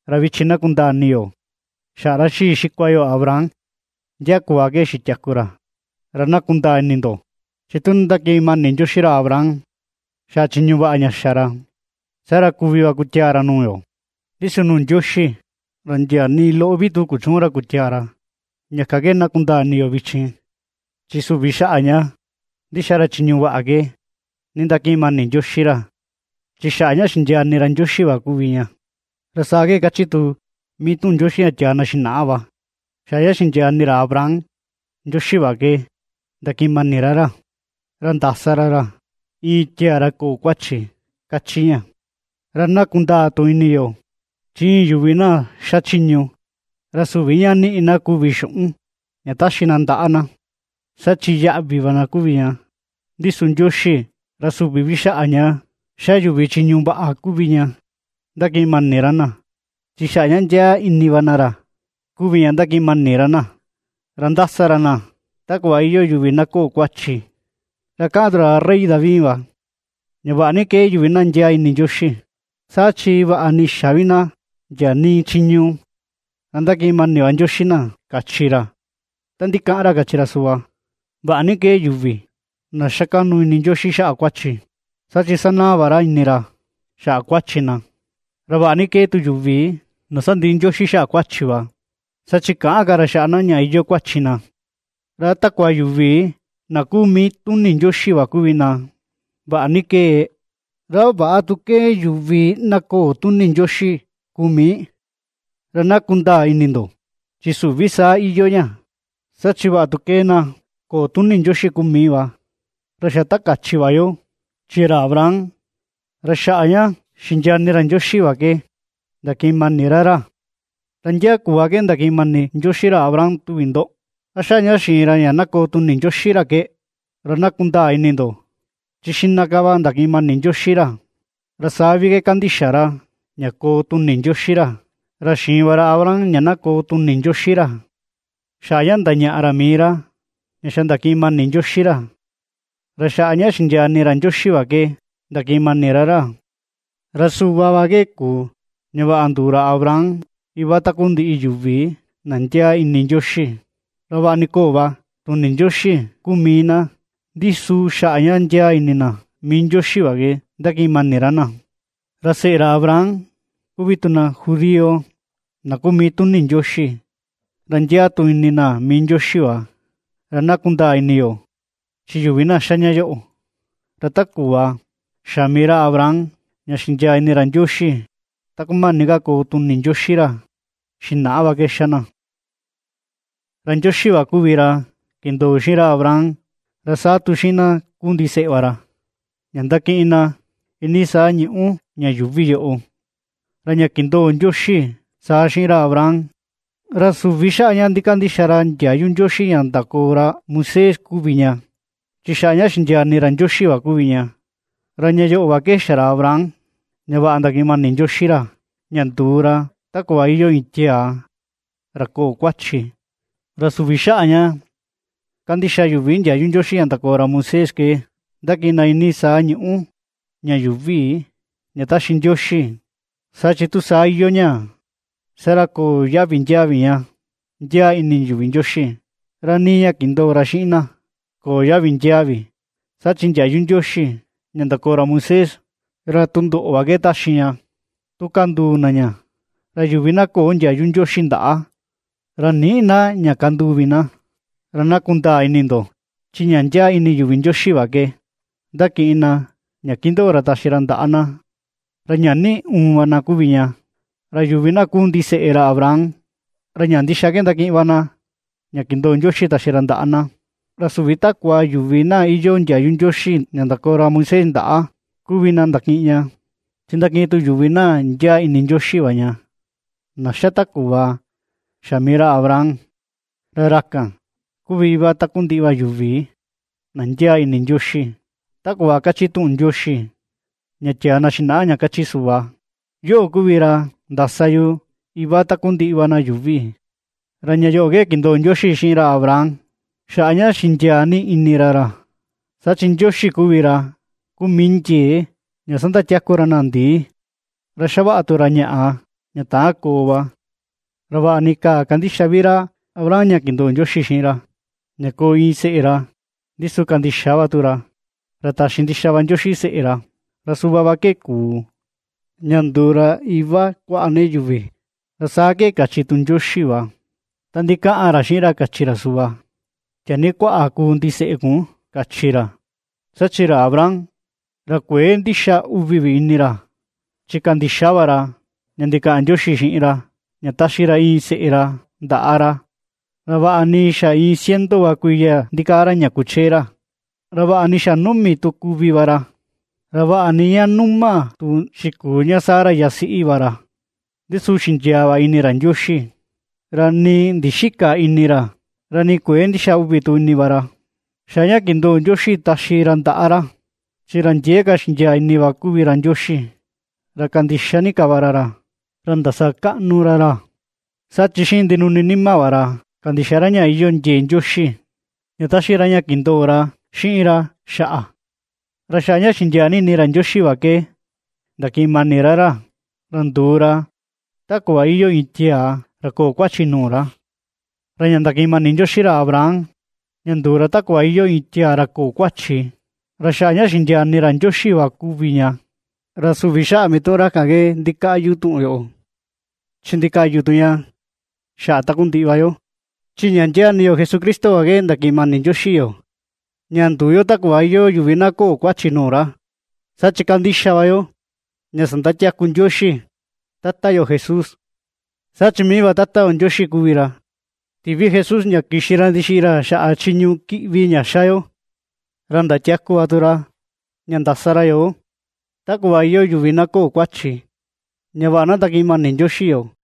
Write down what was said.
Ra vichin na kundaa ini yo, xaꞌa ra xii xikua yo Abraham, ndia kuꞌva ke xitiaku ra. Ra na kundaa ini ndo, chi tu nindakiꞌin mani Ndioxi ra Abraham xaꞌa chiñu vaꞌa ña xa ra, saa ra kuvi va kutiaa ra nuu yoo. Ndi su nuu Ndioxi ra ndia nii loꞌo vi tu kuchüun ra kutiaa ra. Ña kan ke na kundaa ini yo vichin, chi süvi xaꞌa ña ndixa ra chiñu vaꞌa ke nindakiꞌin mani Ndioxi ra, chi xaꞌa ña xindiaa ini ra Ndioxi va kuvi ña, ra saa ke kachi tu mii tuꞌun Ndioxi ña tiaa na xinaꞌa va: “Xaꞌa ña xindiaa ini ra Abraham Ndioxi va ke, ndakiꞌin mani ra ra, ra ndasa ra ra iin tiaa ra köo kuachi”, kachi ña. Ra na kundaa tu ini yo, chi iin yuvi na xachiñu, ra süvi ña niꞌi na kuvi xuꞌun ña taxi na ndaꞌa na, saa chi yaꞌvi va na kuvi ña. Ndi su Ndioxi, ra süvi vi xaꞌa ña ^xa yuvi chiñu vaꞌa kuvi ña ndakiꞌin mani ra na, chi xaꞌa ña ndiaa ini va na ra kuvi ña ndakiꞌin mani ra na, ra ^ndasa ra na ta kuꞌva iyoo yuvi na köo kuachi. Ra kaꞌan tu ra rey David va, ña vaꞌa ni ^kee yuvi na ndiaa ini Ndioxi, saa chi vaꞌa ni xä vi na ndia nii chiñu, ra ndakiꞌin mani va Ndioxi na, kachi ra. Ta ndikaꞌan ra kachi ra suꞌva: Vaꞌa ni ^kee yuvi na ^xa kaꞌnu ini Ndioxi xaꞌa kuachi, saa chi sanaa va ra ini ra xaꞌa kuachi na. Ra vaꞌa ni ^kee tu yuvi na sandiꞌi Ndioxi xa kuachi va, saa chi käꞌan ka ra xaꞌa na ña iyoo kuachi na. ¿Ra a takua yuvi na kuu mii tuni Ndioxi va kuvi na vaꞌa ni ^kee? ¿Ra a väꞌa tu ^kee yuvi na köo tuni Ndioxi kuu mii? Ra na kundaa ini ndo, chi süvi saa iyoo ña, saa chi vaꞌa tu ^kee na köo tuni Ndioxi kuu mii va, ra xa ta kachi va yo, chi ra Abraham ra xaꞌa ña xindiaa ini ra Ndioxi va ke ndakiꞌin mani ra ra. ¿Ra ndia kuꞌva ke ndakiꞌin mani Ndioxi ra Abraham, tuvi ndo? ¿A xaꞌa ña xiin ra ña na koo tuni Ndioxi ra ke? Ra na kundaa ini ndo, chi xiꞌna ka va ndakiꞌin mani Ndioxi ra, ra saa vi ke kandixa ra ña koo tuni Ndioxi ra. Ra xiin va ra Abraham ña na koo tuni Ndioxi ra, xaꞌa ña ndañaꞌa ra mii ra ña xa ndakiꞌin mani Ndioxi ra, ra xaꞌa ña xindiaa ini ra Ndioxi va ke ndakiꞌin mani ra ra. Ra suꞌva va ke kuu ña vaꞌa nduu ra Abraham iva takundiꞌi yuvi na ndiaa ini Ndioxi, ra vaꞌa ni köo va tuni Ndioxi kuu mii na, ndi su xaꞌa ña ndiaa ini na mii Ndioxi va ke ^ndakiꞌin mani ra na. Ra seꞌe ra Abraham kuvi tu na judío na kuu mii tuni Ndioxi, ra ndiaa tu ini na mii Ndioxi va. Ra na kundaa ini yo, chi yuvi na ^xa ña yoꞌo, ra ta kuꞌva xa mii ra Abraham ña xindiaa ni ini ra Ndioxi, ta kumani ka koo tuni Ndioxi ra xinaꞌa va ke ^xa na. Ra Ndioxi va kuvi ra kindoo xiꞌin Abraham, ra saa tu xiꞌin na ^kuu ndiseꞌe va ra, ña ndakiꞌin na iinii saa ñuꞌu ña yuuvi yoꞌo. Ra ña kindoo Ndioxi saa xiꞌin ra Abraham, ra süvi xaꞌa ña ndikandixa ra ndiayu Ndioxi ña ndakoo ra Moisés kuvi ña, chi xaꞌa ña xindiaa ini ra Ndioxi va kuvi ña; ra ña yoꞌo va ke xa ra Abraham ña vaꞌa ndakiꞌin mani Ndioxi ra, ña nduu ra ta kuꞌva iyoo iin tiaa ra köo kuachi. Ra süvi xaꞌa ña kandixa yuvi ndiayu Ndioxi ña ndakoo ra Moisés ke ^ndakiꞌin na iinii saa ñuꞌu ña yuuvi ña ^taxi Ndioxi. Saa chi tu saa iyoo ña, saa ra köo yaꞌvi ndiaa vi ña ndiaa ini yuvi Ndioxi, ra nii ña kindoo ra xiꞌin na köo yaꞌvi ndiaa vi. Saa chi ndiayu Ndioxi ña ndakoo ra Moisés, ra tundoꞌo va ke ^taxi ña tu kanduu na ña, ra yuvi na köo ndiayu Ndioxi ndaꞌa, ra nïꞌi na ña kanduu vi na. Ra na kundaa ini ndo, chi ña ndiaa ini yuvi Ndioxi va ke ^ndakiꞌin na ña ^kindoo ra taxi ra ndaꞌa na, ra ña niꞌi uun va na kuvi ña. Ra yuvi na kuu ndiseꞌe ra Abraham, ra ña ndixa ke ndakiꞌin va na ña kindoo Ndioxi taxi ra ndaꞌa na. Ra süvi takua yuvi na iyoo ndiayu Ndioxi ña ndakoo ra Moisés ndaꞌa kuvi na ndakiꞌin ña, chi ndakiꞌin tu yuvi na ndiaa ini Ndioxi va ña, na ^xa ta kuꞌva xa mii ra Abraham. Ra ra kan, kuvi iva takundiꞌi va yuvi na ndiaa ini Ndioxi. Ta kuꞌva kachi tuꞌun Ndioxi ña tiaa na xinaꞌa ña kachi suꞌva: “Yoꞌo kuvi ra ndasa yu iva takundiꞌi va na yuuvi.” Ra ña yoꞌo ke kindoo Ndioxi xiꞌin ra Abraham xaꞌa ña xindiaa ni ini ra ra, saa chi Ndioxi kuvi ra kuu mii ndiee ña sandatiaku ra na ndii, ra ^xavaꞌa tu ra ñaꞌa, ña täan koo va. Ra vaꞌa ni käà kandixa vi ra Abraham ña kindoo Ndioxi xiꞌin ra, ña koo iin seꞌe ra, ndi su kandixa va tu ra, ra taxi ndixa va Ndioxi seꞌe ra, ra suꞌva va ke kuu ña nduu ra “Iva kuaꞌa ni yuvi.” Ra saa ke kachi tu Ndioxi va, ta ndikaꞌan ra xiꞌin ra kachi ra suꞌva: “Tiaa ni kuaꞌa kuu ndiseꞌe kun”, kachi ra. Saa chi ra Abraham ra kuëe ndixa uvi vi ini ra, chi kandixa va ra ña ndikaꞌan Ndioxi xiꞌin ra ña taxi ra iin seꞌe ra ndaꞌa ra, ra vaꞌa ni xa iin ciento va kuiya ndikaa ra ña ^kuchee ra, ra vaꞌa ni xa numi tu kuvi va ra, ra vaꞌa ni ña numa tu xikuu ña Sara yasiꞌi va ra, ndi su xindiaa va ini ra Ndioxi. Ra nii ndixïka ini ra, ra nii kuëe ndixa uvi tu ini va ra, xaꞌa ña kindoo Ndioxi taxi ra ndaꞌa ra, chi ra ndiee ka xindiaa ini va kuvi ra Ndioxi, ra kandixa ni ka va ra ra, ra ndasakaꞌnu ra ra. Saa chi xiꞌin ndinuni nima va ra kandixa ra ña iyoo ndiee Ndioxi, ña taxi ra ña kindoo ra xiꞌin ra xaꞌa. Ra xaꞌa ña xindiaa ni ini ra Ndioxi va ke ndakiꞌin mani ra ra, ra nduu ra ta kuꞌva iyoo iin tiaa ra köo kuachi nuu ra. Ra ña ndakiꞌin mani Ndioxi ra Abraham, ña nduu ra ta kuꞌva iyoo iin tiaa ra köo kuachi, ra xaꞌa ña xindiaa ini ra Ndioxi va kuvi ña, ra süvi xaꞌa mituꞌun ra kan ke ndikaꞌyu tuꞌun yoꞌo, chi ndikaꞌyu tu ña xaꞌa takundiꞌi va yo. Chi ña ndiaa ini yo Jesucristo va ke ndakiꞌin mani Ndioxi yoo, ña nduu yo ta kuꞌva iyoo yuvi na köo kuachi nuu ra, saa chi ^kandixa va yo ña sandatiaku Ndioxi, Tata yo Jesús. Saa chi mii va Ndioxi kuvi ra tiꞌvi Jesús ña kixi ra ndixiꞌi ra xaꞌa chiñu kiꞌvi ña ^xa yo, ra ndatiaku va tu ra ña ndasa ra yoo, ta kuꞌva iyoo yuvi na köo kuachi, ña vaꞌa na ndakiꞌin mani Ndioxi yoo.